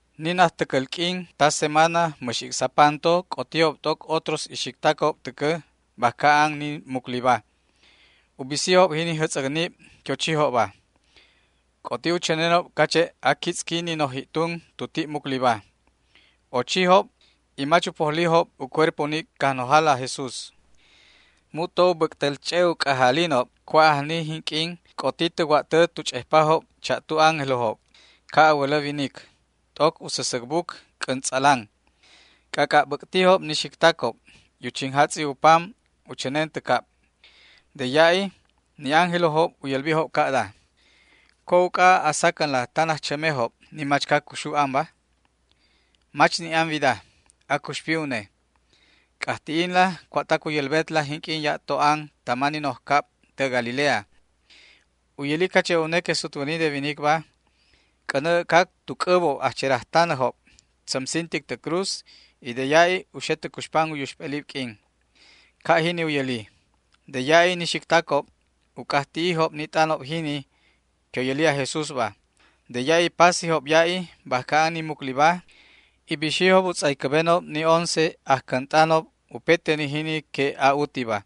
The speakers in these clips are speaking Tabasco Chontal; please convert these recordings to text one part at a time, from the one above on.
Ni najtäcäl q'uin ta semana mäx ic'sapanto c'otijob t'oc otros ixictacob täcä bajca an ni mucliba. U bisijob jini jätz'äcnib que u chijobba. C'oti u chänenob cache' aquitz'qui ni noj ji'tun tu ti' mucliba. Ochijob y mach u pojlijob u cuerpo ni Cajnojala aj Jesús. Mu'to u bäc'täl ch'e' u c'ajalinob cua' ajni jinq'uin c'oti tä wa'tä tu ch'ejpajob cha'tu ángelojob, ca' a wälä winic, t'oc u säsäc buc c'äntz'alanba. C'ac'a' bäc'tijob ni ixictacob y u chinjatz'i u pam u chänen tä cab. De ya'i ni ángelojob u yälbijob ca'da: ―¿Cua' uc'a a sacänla tan ajchämejob ni machca cuxu anba? Mach ni' an wida; acuxpi une. C'ajti'inla cua'tac u yälbetla jinq'uin ya'to an tama ni noj cab tä Galilea. U yäli cache' une que sutwäni de winicba c'änä äc'cac tu c'äbob ajcherajtanäjob, tzämsintic tä cruz y de ya'i u xe tä cuxpan u yuxp'elib q'uin. Ca' jini u yäli. De ya'i ni ixictacob u c'ajti'ijob ni t'anob jini que u yäli aj Jesúsba. De ya'i pasijob ya'i bajca an ni mucliba y bixijob u tz'aycäbenob ni once ajcänt'anob upete ni jini que a'utiba.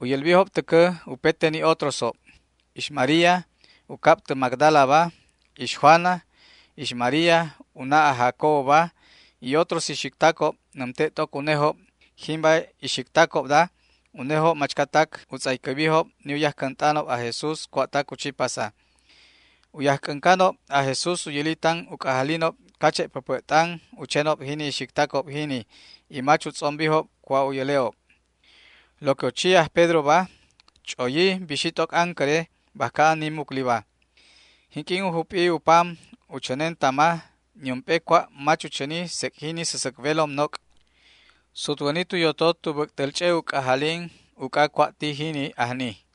U yälbijob täcä upete ni otrosjob. Ix María, u cab tä Magdalaba, ix Juana, ix María, u na' aj Jacoboba y otros ixictacob nämte' t'oc unejob, jimba ixictacobda unejob machcatac u tz'aycäbijob ni u yajc'äncanob aj Jesús cua'tac u chi pasa. U yajc'äncanob aj Jesús u yäli tan u c'ajalinob cache' päpä' t'an u chenob jini ixictacob jini y mach u tz'ombijob cua' u yäle'ob. Lo que u chi aj Pedroba, ch'oyi bixi t'oc ancäre bajca an ni mucliba. Jinq'uin u jup'i u pam u chänen tama, niump'e cua' mach u chäni sec' jini säsäc welom noc'. Sutwäni tu yotot u bäc'täl ch'e' u c'ajalin uc'a cua' ti jini ajni.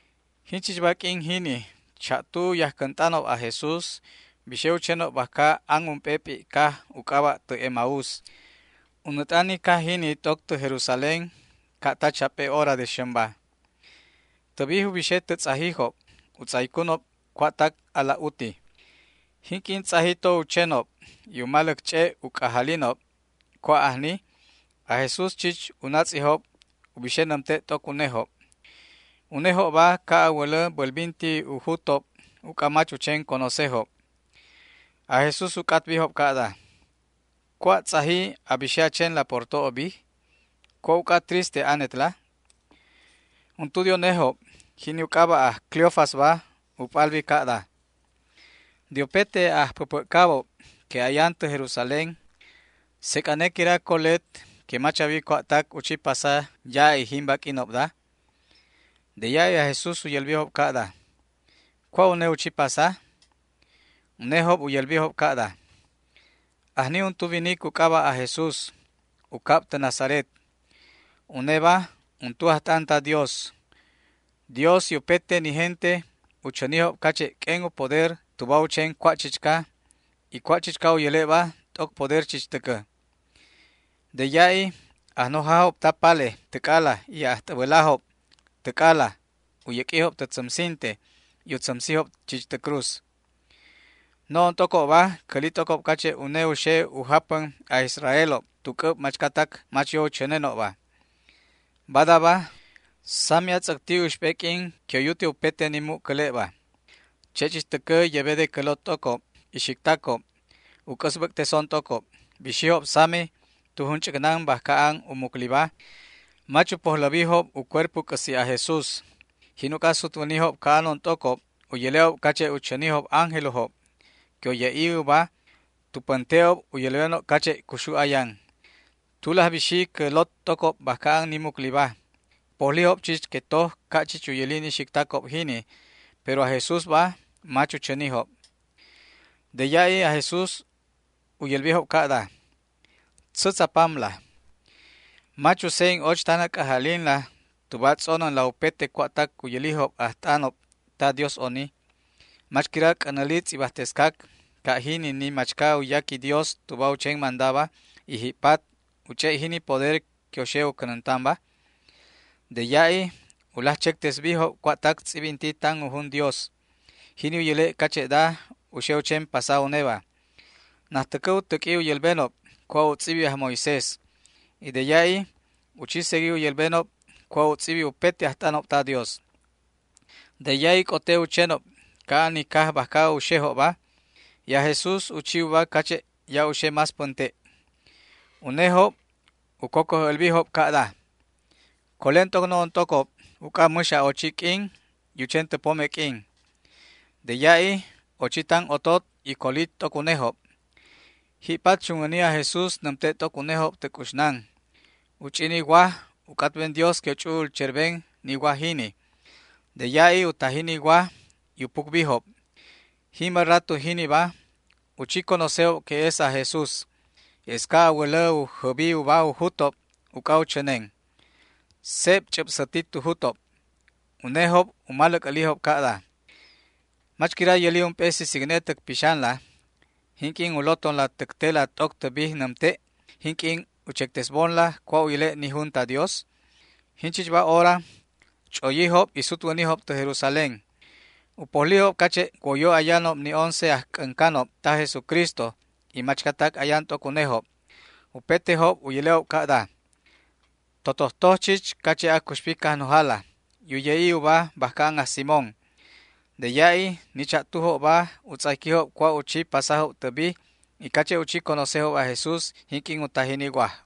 Jinchichba q'uin jini cha'tu u yajcänt'anob aj Jesús bixe u chenob bajca an ump'e p'i' caj u c'aba' tä Emaús. U nät'an ni caj jini t'oc tä Jerusalén ca' ta chap'e hora de xämba. Tä bij u bixe tä tz'ajijob u tz'aycunob cua'tac alaj uti. Jinq'uin tz'aji to u chenob y u maläc ch'e' u c'ajalinob cua' ajni, aj Jesús chich u natz'ijob u bixe nämte' t'oc unejob. Unejobba ca' a wälä bälbinti u jutob uc'a mach u chen conocejob. Aj Jesús u c'atbijob ca'da: ―¿Cua' tz'aji na bixe a chenla por to'o bij? ¿Cua' uc'a triste anetla? Untu de unejob, jini u c'aba' aj Cleofasba, u p'albi ca'da: ―¿De upete ajpäpä'cabob que ayan tä Jerusalén, sec' ane quira colet que mach a wi cua'tac u chi pasa ya'i jimba q'uinobda? De ya'i aj Jesús u yälbijob ca'da: ―¿Cua' une u chi pasa? Unejob u yälbijob ca'da: ―Ajni untu winic u c'aba' aj Jesús, u cab tä Nazaret. Uneba untu ajt'an ta Dios. Dios y upete ni gente u chänijob cache' q'uen u poder tuba u chen cua' chichca, y cua' chichca u yäle'ba t'oc poder chich täcä. De ya'i ajnojajob ta pale täc'ala y ajt'äbälajob täc'ala u yäq'uijob tä tzämsinte y u tzämsijob chich tä cruz. No'on t'ocobba cäli t'ocob cache' une u xe u japän aj Israelob tu c'äb machcatac mach yo u chänenobba. Badaba, sami atz'äcti uxp'e q'uin que u yute upete ni jinda cäle'ba. Che' chich täcä yebe de cä lot t'ocob ixictacobba u c'äsbäc'teson t'ocob. Bixijob sami tu junch'äcnan bajca an u mucliba. Mach u pojläbijob u cuerpo c'äsi' aj Jesús. Jin uc'a sutwänijob ca'anon t'ocob u yäle'ob cache' u chänijob ángelojob que u ye'i ubajob tu pänte'job u yälbenob cache' cuxu ayan. Tulaj bixi cä lot t'ocob bajca an ni mucliba. U pojlijob chich que toj ca' chich u yäli ni ixictacob jini, pero aj Jesúsba mach u chänijob. De ya'i aj Jesús u yälbijob ca'da: ―Tzätz a pamla. Mach u se'en och tan a c'ajalinla tuba a tz'onänla upete cua'tac u yälijob ajt'anob ta Dios oni. ¿Mach quira c'änäli tz'ibajtescac ca' jini ni machca u yaqui Dios tuba u chen mandaba, y ji'pat u ch'e' jini poder que u xe u cänäntanba? De ya'i u laj chectesbijob cua'tac tz'ibinti tan u jun Dios, jini u yäle' cache'da u xe u chen pasa uneba. Najtäcä u täq'ui u yälbenob cua' u tz'ibi aj Moisés, y de ya'i u chi segui u yälbenob cua' u tz'ibi upete ajt'anob ta Dios. De ya'i c'ote u chenob ca'an ni caj bajca u xejobba, y aj Jesús u chi uba cache' ya' u xe más pänte'. Unejob u cocoj älbijob ca'da: ―Colen t'oc no'on t'ocob uc'a mäx a'ochiq'uin y u chen tä pome q'uin. De ya'i ochi tan otot y coli t'oc unejob. Ji'pat chunwäni aj Jesús nämte' t'oc unejob tä c'uxnan. U ch'i ni waj u c'atben Dios que u ch'u'ul cherben ni waj jini. De ya'i u taji ni waj y u pucbijob. Jimba rato jiniba u chi conocejob que es aj Jesús. Es ca' a wälä u jäbi uba u jutob uc'a u chänen. Seb ch'äbsäti tu jutob. Unejob u maläc älijob ca'da: ―¿Mach quira yäli ump'e sisicne täc pixanla jinq'uin u lotonla täc tela t'oc tä bij nämte', jinq'uin u chectesbonla cua' u yäle' ni jun ta Dios? Jinchichba hora ch'oyijob y sutwänijob tä Jerusalén. U pojlijob cache' woyo ayanob ni once ajc'äncanob taj Jesucristo y machcatac ayan t'oc unejob. Upetejob u yäle'ob ca'da: ―Totojtoj chich cache' acuxpi Cajnojala y u ye'i uba bajca an aj Simón. De ya'i ni cha'tujobba u tz'ayquijob cua' u chi pasajob tä bij y cache' u chi conocejob aj Jesús jinq'uin u taji ni waj.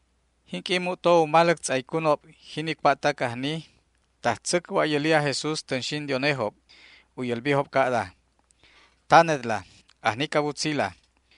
Jinq'uin mu'to u maläc tz'aycunob jini cua'tac ajni, tajtzäc wa'yäli aj Jesús tänxin de unejob. U yälbijob ca'da: ―Tanetla, ajnic a wutzila.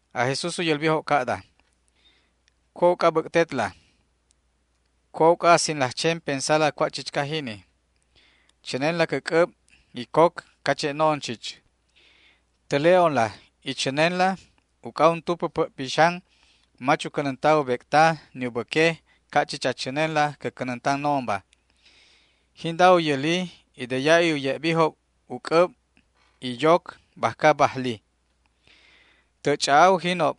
Aj Jesús u yälbijob ca'da: ―¿Cua' uc'a bäc'tetla? ¿Cua' uc'a a sinlaj chen pensala cua' chichca jini? Chänenla cä c'äb y coc cache' no'on chich. Täle'onla y chänenla, uc'a untu päpä' pixan mach u cänänta u bec'ta ni u bäque ca' chich a chänenla cä cänäntan no'onba. Jinda u yäli y de ya'i u ye'bijob u c'äb y yoc bajca bajli. Tä' ch'a'a ujinob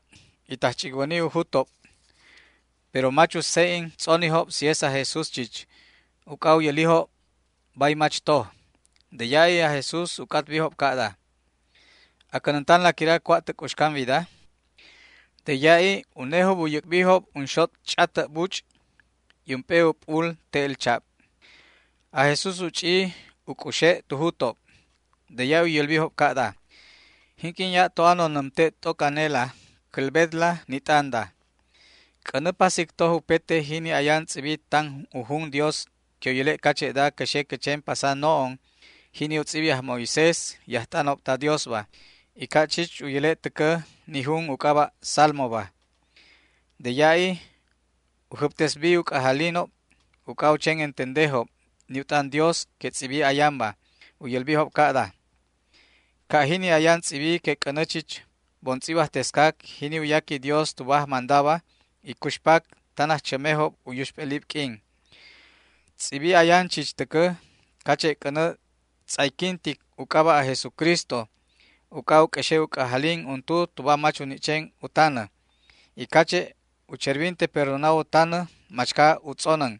y tajch'icwäni u jutob, pero mach u se'en tz'onijob si es aj Jesús chich, uc'a u yälijob bay mach toj. De ya'i aj Jesús u c'atbijob ca'da: ―¿A cänäntanla quira cua' tä c'uxcan wida? De ya'i unejob u yäc'bijob unxot' ch'atä' buch' y ump'e u p'ul te'el chab. Aj Jesús u ch'i u c'uxe' tu jutob. De ya'i u yälbijob ca'da: ―Jinq'uin ya'to anon nämte' t'oc anela cälbetla ni t'anda: C'änä pasic toj upete jini ayan tz'ibi tan u jun Dios que u yäle' cache'da cä xe cä chen pasa no'on, jini u tz'ibi aj Moisés y ajt'anob ta Diosba, y ca' chich u yäle' täcä ni jun u c'aba' Salmoba. De ya'i u jäbtesbi u c'ajalinob uc'a u chen entendejob ni u t'an Dios que tz'ibi ayanba. U yälbijob ca'da: ―Ca' jini ayan tz'ibi que c'änä chich bon tz'ibajtescac jini u yaqui Dios tuba ajmandaba y cuxpac tan ajchämejob u yuxp'elib q'uin. Tz'ibi ayan chich täcä cache' c'änä tz'ayquintic u c'aba' aj Jesucristo uc'a u q'uexe' u c'ajalin untu tuba mach u ni' chen u tanä, y cache' u cherbinte perdona u tanä machca u tz'onän.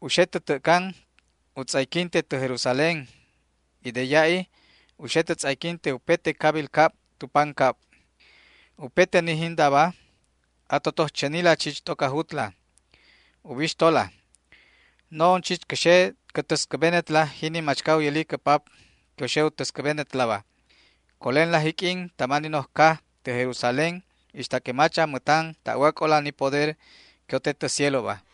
U xe tä tä'can u tz'ayquinte tä Jerusalén y de ya'i u xe tä tz'ayquinte upete cabil cab tu pancab. Upete ni jindaba a totoj chänila chich t'oc a jutla. Ubixtola, no'on chich cä xe cä täscäbenetla jini machca u yäli cä Pap que u xe u täscäbenetlaba. Colenla jiq'uin tama ni noj caj tä Jerusalén ixta que mach a mätan ta'wac'ola ni poder que u te tä cieloba.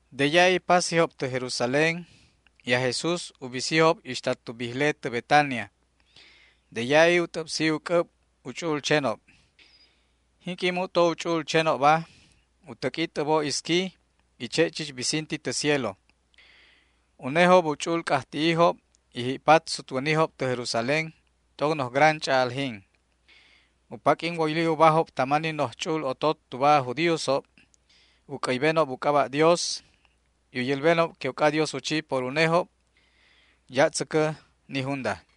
De ya'i pasijob tä Jerusalén y aj Jesús u bisijob ixta tu bijle tä Betania. De ya'i u t'äbsi u c'äb u ch'u'ul chenob. Jinq'uin mu'to u ch'u'ul chenobba u täq'ui t'äbo isqui y che' chich bisinti tä cielo. Unejob u ch'u'ul c'ajti'ijob y ji'pat sutwänijob tä Jerusalén t'oc noj gran ch'a'aljin. U paq'uin woyli ubajob tama ni noj ch'u'ul otot tuba aj judíosob u c'äybenob u c'aba' Dios y u yälbenob que uc'adios u chi por unejob. Ya' tzäcä ni junda.